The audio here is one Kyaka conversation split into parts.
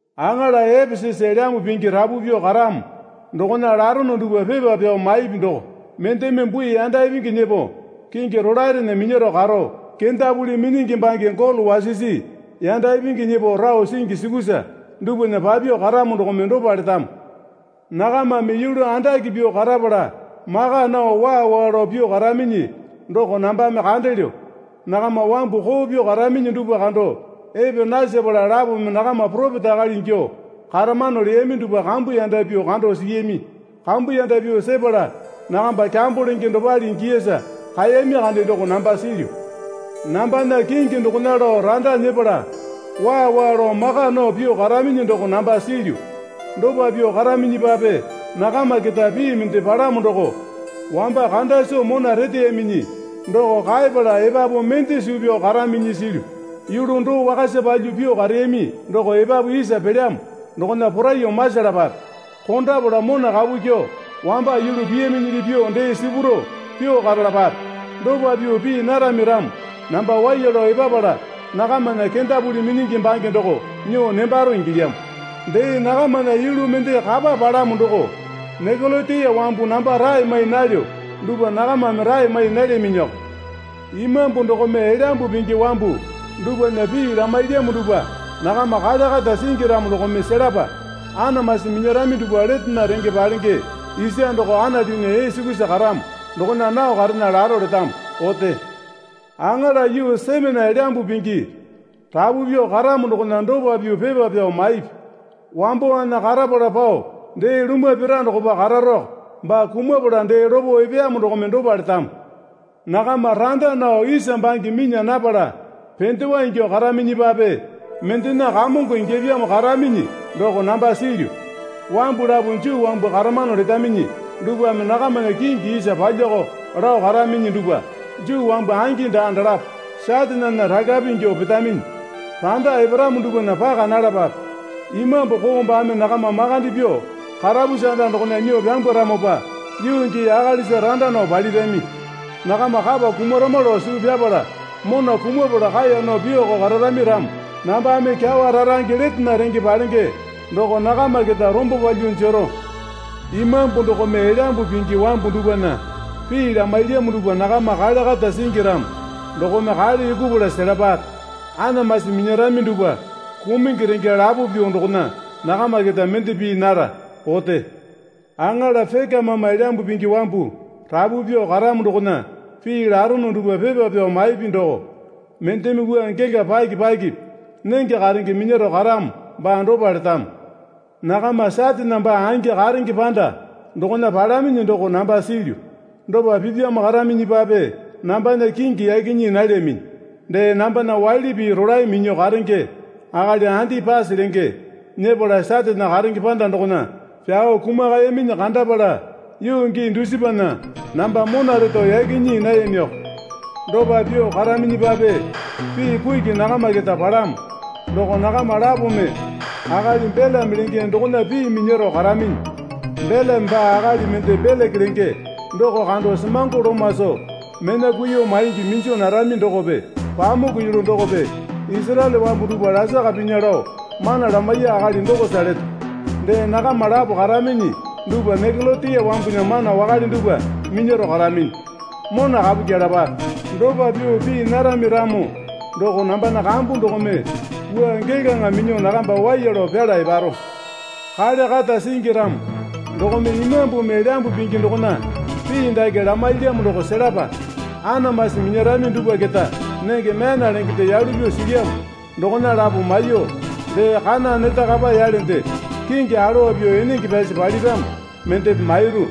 Aŋala Epesasa Elyambu Pingi rapu pyuo karamo dokona larono dupwa pepa pyao maipi doko, Mendeme bui yanda ipingi nyepo kingi rolaerena minyaro karo, kendapuli minyingi bange golo wasisi yanda ipingi nyepo rao singi sukusa dupwana papyuo karamo dokome dopa letamo. Nakamame yulu andake pyuo karapala maka nao waa waa lao pyuo karaminyi doko nambame kandelyo. Nakama wambu koo pyuo karaminyi dupwa kando epe nasepala lapome nakama poropeta akali ingyuo karamano leyami dupwa kambuyanda pyuo kando siyami. Kambuyanda pyuo sepala nakamba kyambo lenge dopale ingiyasa kaeyami kande doko namba silyu. Nambana kingi dokona lao randa nyepala waa waa lao maka nao pyuo karaminyi doko namba silyu. Dopa pyuo karaminyipape nakama keta pii mende palamo doko wamba kanda soo mona reteyaminyi doko kaeyapala epapu mende suu pyao karaminyi silyu. Yulu doo wakasa palyuo pyuo kareyami doko epapu isa pelyamo dokona poraiyuo masalapape. Kondapala mona kapu kyuo wamba yulu piyaminyili pyuo dee sipurao pyuo karalapape. Dopa pyuo pii narami ramo namba waiya lao epapala nakamana kendapuli minyingi bange doko nyuo nembaro ingilyamo. Dee nakamana yulu mende kapa palamo doko Nikolatiya wambu namba rae mai nalyo dupwa nakamame rae mai nalyaminyiko. Imambu dokome Elyambu Pingi wambu dupwana pii lamailyamo dupwa nakama kale kata singi ramo dokome selapa. Anamasi minyarami dupwa letena renge palenge isa doko Anatunya ee sukusa karamo dokona nao karena laro letamo. Ote. Aŋala yuu Semena Elyambu Pingi rapu pyuo karamo dokona dopa pyuo pepa pyao maipi. Wambowana karapala pao dee lumwa pira dokopa kararako baa kumapala dee lopo epeyamo dokome dopa letamo. Nakama randa nao isa bange minya napala pendewa ingyuo karaminyipape mendena kamongo ingyapyamo karaminyi doko namba silyu. Wambu lapo Juu wambu karamano letaminyi dupwame nakamana kingi isa palyako lao karaminyi dupwa Juu wambu angi daa, dalapo Satane ralape ingyuo petaminyi. Randa eparamo dupwana paka nalapape. Imambu koo baame nakama makande pyuo karapusi anda dokona nyuo pyambwaramopa yuu gii akalisa randa nao palirami. Nakama kapa kumarama lao suu pyapala mona kumapala kaeya nao pyuoko kararami ramo nambame kyawa rarange letena renge palenge doko nakama keta rombo palyuo jero. Imambu dokome Elyambu Pingi wambu dupwana pii lamailyamo dupwa nakama kale kata singi ramo dokome kale yukupala selapape. Anamasi minyarami dupwa kumungi renge lapo pyuo dokona nakama keta mende pii nara. Ote. Aŋala Pekamama Elyambu Pingi wambu rapu pyuo karamo dokona pii larono dupwa pepa pyao maipi doko, Mendeme wua gela paki pakipi nenge karenge minyaro karamo baa dopa letamo. Nakama Satane baa angi karenge panda dokona palaminyi doko namba silyu. Dopa pipyamo karaminyipape nambana kingi yaki nyii nalyaminyi. Dee nambana waili pii rolae minyuo karenge akali Andipasa lenge nyepala Satane karenge panda dokona pyao kumakayaminyi kandapala yuu gii dusipana namba mona reto yaki nyii nayamiko. Dopa pyuo karaminyipape pii kuki nakama keta palamo. Doko nakama lapome akali Belame lenge dokona pii minyaro karaminyi. Belame baame akali mende Beleke lenge doko kando semango loma soo mena kuiyuo maingi minju narami dokope pamuku yulu dokope Isaraele wambu dupwa lasaka pinya lao mana lamaiya akali dokosa leto. Dee nakama lapo karaminyi dupwa Nikolatiya wambunya mana wakale dupwa minyaro karaminyi. Mona kapu kyelapape. Dopa pyuo pii narami ramo doko nambana kambu dokome wua gelaŋa minyuo nakamba waiya lao pyala eparo. Kale kata singi ramo dokome Imambumi Elyambu Pingi dokona pii dake lamailyamo doko selapa. Anamasi minyarami dupwa keta nenge myana lengende yalu pyuo silyamo dokona lapo maiyuo dee kana neta kapa yalende kingi alowa pyuo enenge pyasi paliramo mendepe mairu.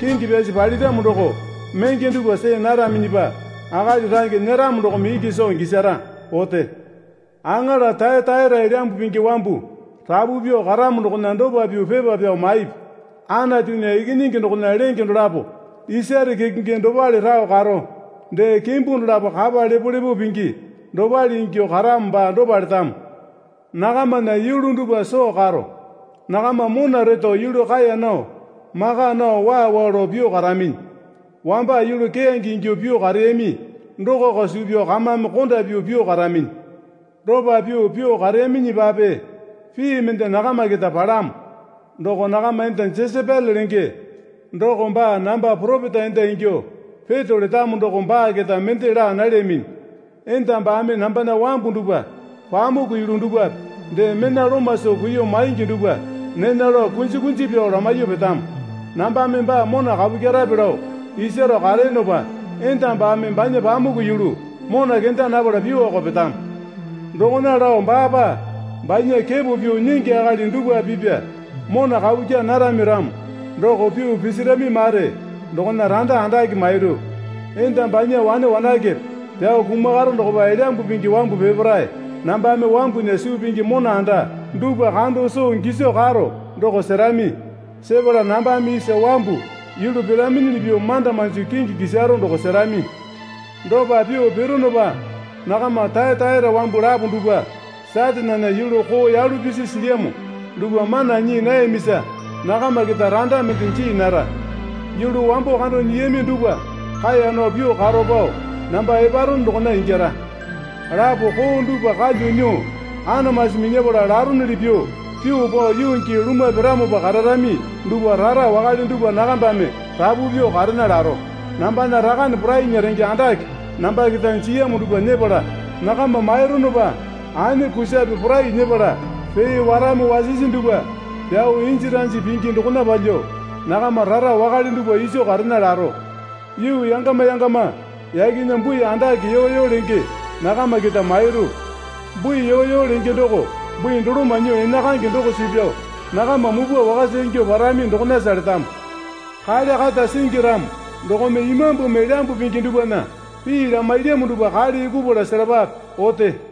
Kingi pyasi paliramo doko menge dupwa see naraminyipa akali range nyeramo dokome iki soo gisara. Ote. Aŋala Tayataira Elyambu Pingi wambu rapu pyuo karamo dokona dopa pyuo pepa pyao maipi. Anatunya Ikinyingi dokona lenge dolapo isare kekenge dopale rao karo, dee kimbu dolapo kapa lepolepo pingi dopale ingyuo karamo baa dopa letamo. Nakamana yulu dupwa soo karo. Nakama mona retao yulu kaeya nao, maka nao waa waa lao pyuo karaminyi. Wamba yulu keyange ingyuo pyuo kareyami dokoko suu pyao kamame konda pyuo pyuo karaminyi. Dopa pyuo pyuo kareyaminyipape pii mende nakama keta palamo. Doko nakama enda Jesapele lenge doko baa namba poropeta enda ingyuo peto letamo doko baa keta mende laa nalyaminyi. Enda baame nambana wambu dupwa pamuku yulu dupwape dee mena loma soo kuiyuo maingi dupwa nena lao kunji kunji pyao lamaiyuo petamo. Nambame baa mona kapu kyerape lao isaro kareyonopa enda baame banya pamuku yulu mona kenda napala pyuoko petamo. Dokona lao baapa banya kepo pyuo nyingi akali dupwape pipa mona kapu kyaa narami ramo doko pyuo pisirami mare dokona randa andake mairu. Enda banya wane wanakepe pyao kumakaro dokopa Elyambu Pingi wambu peparae nambame wambunya suu pingi mona anda dupwa kando soo giso karo doko serami. Sepala nambame isa wambu yulu piraminyili pyuo manda manjo kingi kisaro doko serami. Dopa pyuo pironopa nakama Tayataira wambu lapo dupwa Satanena yulu koo yalu pisi silyamo dupwa mana nyii nayamisa nakama keta randa mende jii nara. Yulu wambo kando nyiyami dupwa kaeya nao pyuo karo pao namba eparono dokona ingyara. Lapo koo dupwa kalya nyuo anamasi minyapala laronyili pyuo pyuo pao yuu gii lumwa piramopa kararami dupwa rara wakale dupwa nakambame rapu pyuo karena laro. Nambana Rakane porainya renge andake namba keta jiyamo dupwa nyepala nakama maironopa ane kusape porai nyepala pee warame wasisi dupwa pyao inji ranji penge dokona palyuo nakama rara wakale dupwa iso karena laro. Yuu yangama yangama yakena bui andake yoyo lenge nakama keta mairu. Bui yoyo lenge doko bui doloma nyuo enakaenge doko suu pyao nakama mupwa wakasa ingyuo parami dokonasa letamo. Kale kata singi ramo dokome Imambumi Elyambu Pingi dupwana pii lamailyamo dupwa kale yukupala selapape. Ote.